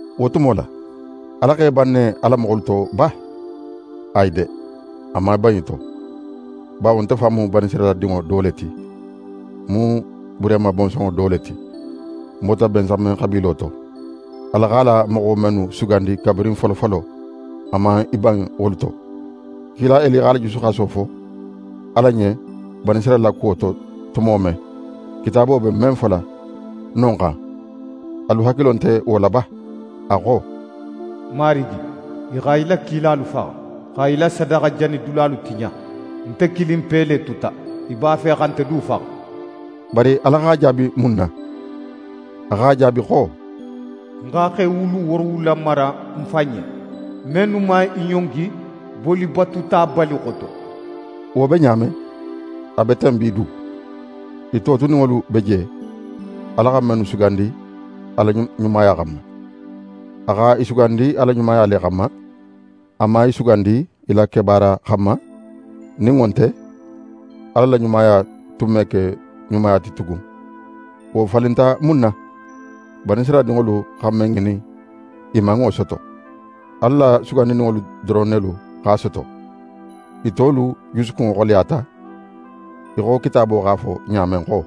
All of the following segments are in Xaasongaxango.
Wo tumo la, Ala x'é ban a la moxolu to le ba? Ayi de! A man í ban i to. Bawo nte fan mu Banisirayila dinŋo do le ti. Ń mu Burehima bonsonŋo do le ti. Ń bota Bensamen xabiilo to. Ala x'a la moxo mennu sugandi kabirin folofolo, a man í ban wolu to. Kila Eli x'a la jusuxaso fo Ala ɲen Banisirayila la kuwo to tumo men, Kitaabo be men fola non xan, alu hakilo nte wo la ba? A xo: «Marigi, i xa í la kilalu faxa, xa í la sadaxajanidulalu tiɲa. Nte kilinpe le tuta. I b'a fe xa nte du faxa.» Bari Ala x'a jaabi mun na? A x'a jaabi xo: «Ń xa xe wulu woorowula mara ń fan ɲen, mennu man i ɲongi bolibatuta Baali xoto.» Wo be ɲa men, a be ten bi du, i totuninŋolu be je, Ala xa mennu sugandi a la ɲumaya xanma. A xa i sugandi a la ɲumaya le xanma. A man i sugandi i la kebaara xanma; nin wo nte, Ala la ɲumaya tun me ke ɲumaya ti tugun. Wo falinta mun na? Banisirayila dinŋolu xa men ŋinin, i man wo soto. Ala la sugandininŋolu doron nelu x'a soto. I tolu jusukunŋo xoleyata, í xo Kitaabo x'a fo ɲa men xo: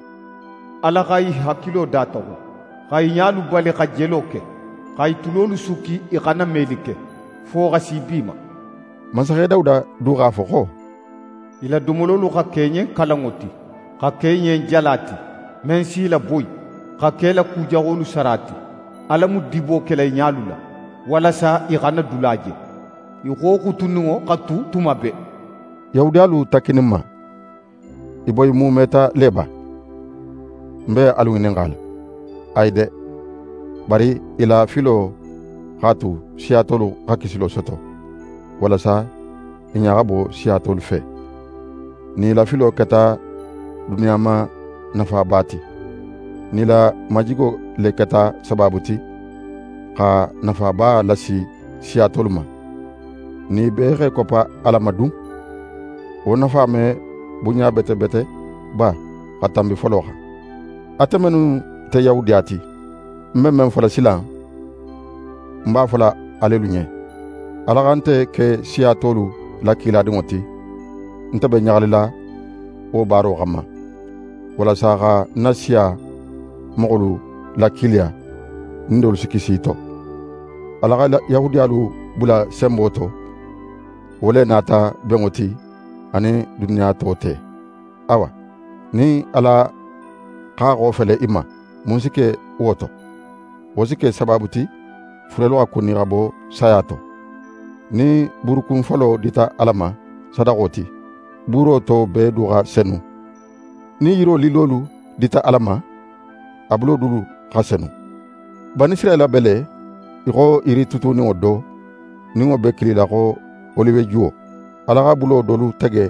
«Ala xa i hakilo dataxun, xa i ɲalu bali xa jelo ke, xa i tulolu sukki i xana meli ke, fo xa si bi ma.» Mansaxe Dawuda du x'a fo xo: «I la domololu xa ke i ɲen kalanŋo ti, xa ke i ɲen jala ti, men s'i laboyi, xa ke i la ku jaxolu sara ti. Ala mu dibo kela i ɲalu la, walasa i xana dula je. I xo xutuninŋo xa tu tuma bee.» Yahudiyalu takkininma, i boyimuumeta le ba? Ń be alu ŋininxala. Ayi de! Bari i la filo x'a tu siya tolu xa kisilo soto, walasa i ɲa xa bo siya tolu fe. Nin i la filo keta duniya ma nafaba ti, nin i la majigo le keta sabaabu ti xa nafaba lasi siya tolu ma, nin i bee x'e koppa Ala ma dun? Wo nafa me bunɲa bete bete ba xa tanbi folo xan? Ate mennu nte Yahudiya ti, ń be men fola silan, ń b'a fola alelu ɲen. Ala xa nte ke siya tolu la kiladinŋo ti. Nte be ɲaxalila wo baaro xanma, walasa xa ń na siya moxolu lakiiliya, nin dolu si kisi i to. Ala xa Yahudiyalu bula senbo to, wo le nata benŋo ti a nin duniya to te. Awa, nin Ala x'a xofele i ma, mun si ke wo to? Wo si ke sabaabu ti furelu xa kuni xa bo saya to. Nin buurukun folo dita Ala ma sadaxo ti, buuro to bee du xa senu. Nin yiro lillolu dita Ala ma, a bulo dulu xa senu. Banisirayila be le í xo yiri tutuninŋo do, nin wo be kilila xo oliwejuwo. Ala xa bulo dolu tege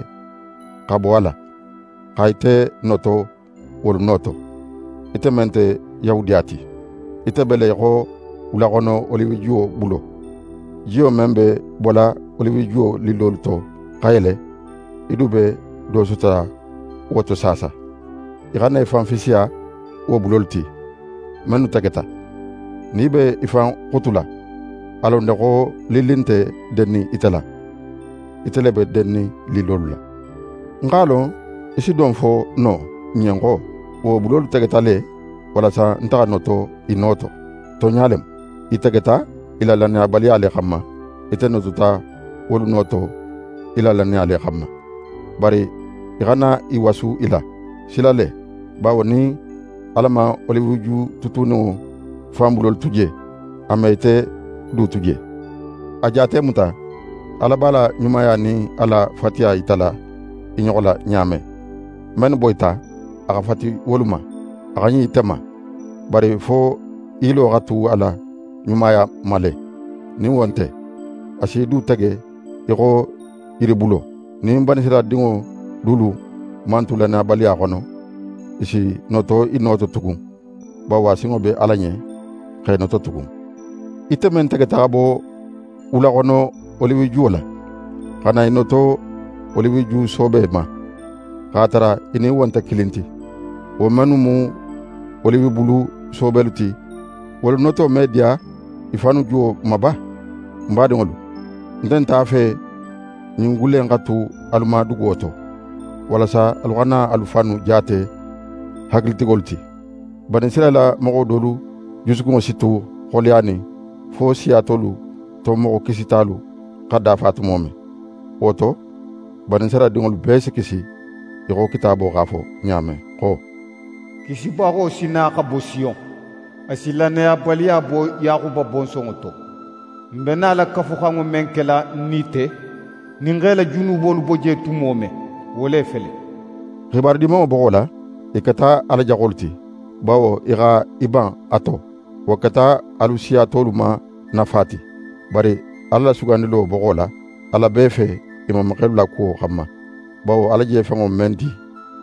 xa bo a la, xa ite noto wolu no to, ite men nte Yahudiya ti. Ite be le í xo wulaxono oliwejuwo bulo. Jiyo men be bola oliwejuwo lillolu to xa yele, í du be do sotola wo to saasa. Í xana í fan fisiya wo bulolu ti, mennu tegeta. Nin í be í fan xutula, a lon de xo lilli nte dennin ite la; ite le be dennin lillolu la. Ń x'a lon í si don fo no ń ɲen xo: «Wo bulolu tegeta le, walasa nte xa noto i no to.» Tonɲa le mu, i tegeta i la lannayabaliya le xanma. Ite notota wolu no to í la lannaya le xanma. Bari í xana í wasu i la; sila le! Bawo nin Ala man oliweju tutuninŋo fan bulolu tu je, a me ite du tu je. A jaate muta, Ala b'a la ɲumaya nin a la fatiya yitala i ɲoxo la ɲa men: Mennu boyita, a xa fati wolu ma. A xa ɲin ite ma. Bari fo í yilo xa tu a la ɲumaya ma le; nin wo nte, a s'í du tege í xo yiribulo. Nin Banisirayila dinŋo dulu man tu lannayabaliya xono, i si noto i no to tugun, bawo a sinŋo be Ala ɲen x'e noto tugun. Ite men tegeta xa bo wulaxono oliwejuwo la, xa na í noto oliweju soobe ma, x'a tara í nin wo nte kilin ti; wo mennu mu oliwebulu soobelu ti, wolu noto me diya i fannu juwo ma ba? Ń badinŋolu, ń nte a fe ɲin gulle in xa tu alu ma duguwo to, walasa alu xana alu fannu jaate hakilitigolu ti: Banisirayila moxo dolu jusukunŋo si tu xoleyanin fo siya tolu to moxo kisitalu xa dafa tumo men. Wo to, Banisirayila dinŋolu bee si kisi, í xo Kitaabo x'a fo ɲa men xo: «Kisibaxo si na xa bo Siyon. A si lannayabaliya bo Yaxuba bonsonŋo to. Ń be nala Kafuxanŋo men kela ń nin i te, nin ń x'e la junubolu bo je tumo men, wo le fele.» xibaru Dimanŋo boxo la, i keta Ala jaxolu ti, bawo i xa i ban a to. Wo keta alu siya tolu ma nafa ti. Bari Ala la sugandilo boxo la, Ala b'e fe i mamaxelu la kuwo xanma. Bawo Ala je fenŋo men di,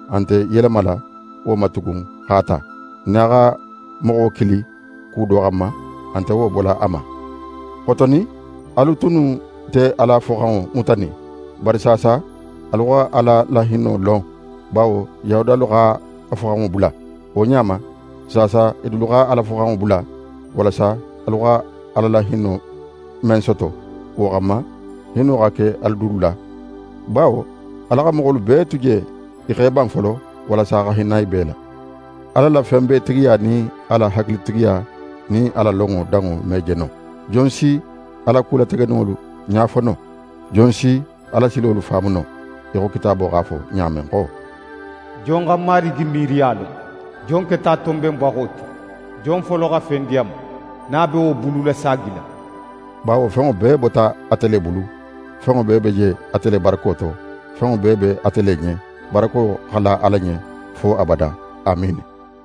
a nte í yelemala wo ma tugun x'a ta. Nin a xa moxo kili ku do xanma, a nte wo bola a ma. Xotonin, alu tunnu nte Ala foxanŋo mutanin, bari saasa alu xa Ala la hinno lon, bawo Yahudiyalu x'a foxanŋo bula. Wo ɲa ma, saasa i dulu xa Ala foxanŋo bula, walasa alu xa Ala la hinno men soto, wo xanma, hinno xa ke i dulu la. Bawo Ala xa moxolu bee tu je i x'e ban folo, walasa xa hinna i bee la. Ala la fenbeetigiya nin a la hakilitigiya, nin a la lonŋo danŋo me je no. Jon si a la ku lategeninŋolu ɲa fo no? Jon si a la silolu faamu no? Í xo Kitaabo x'a fo ɲa men xo: «Jon xa Marigi miiriya lon? Jon keta a tonbenbaxo ti? Jon folo xa fen di a ma, nin a be wo bululasaagila?» Bawo fenŋo bee bota ate le bulu. Fenŋo bee be je ate le barako to. Fenŋo bee be ate le ɲen. Barako xa la Ala ɲen fo abada! Amiini.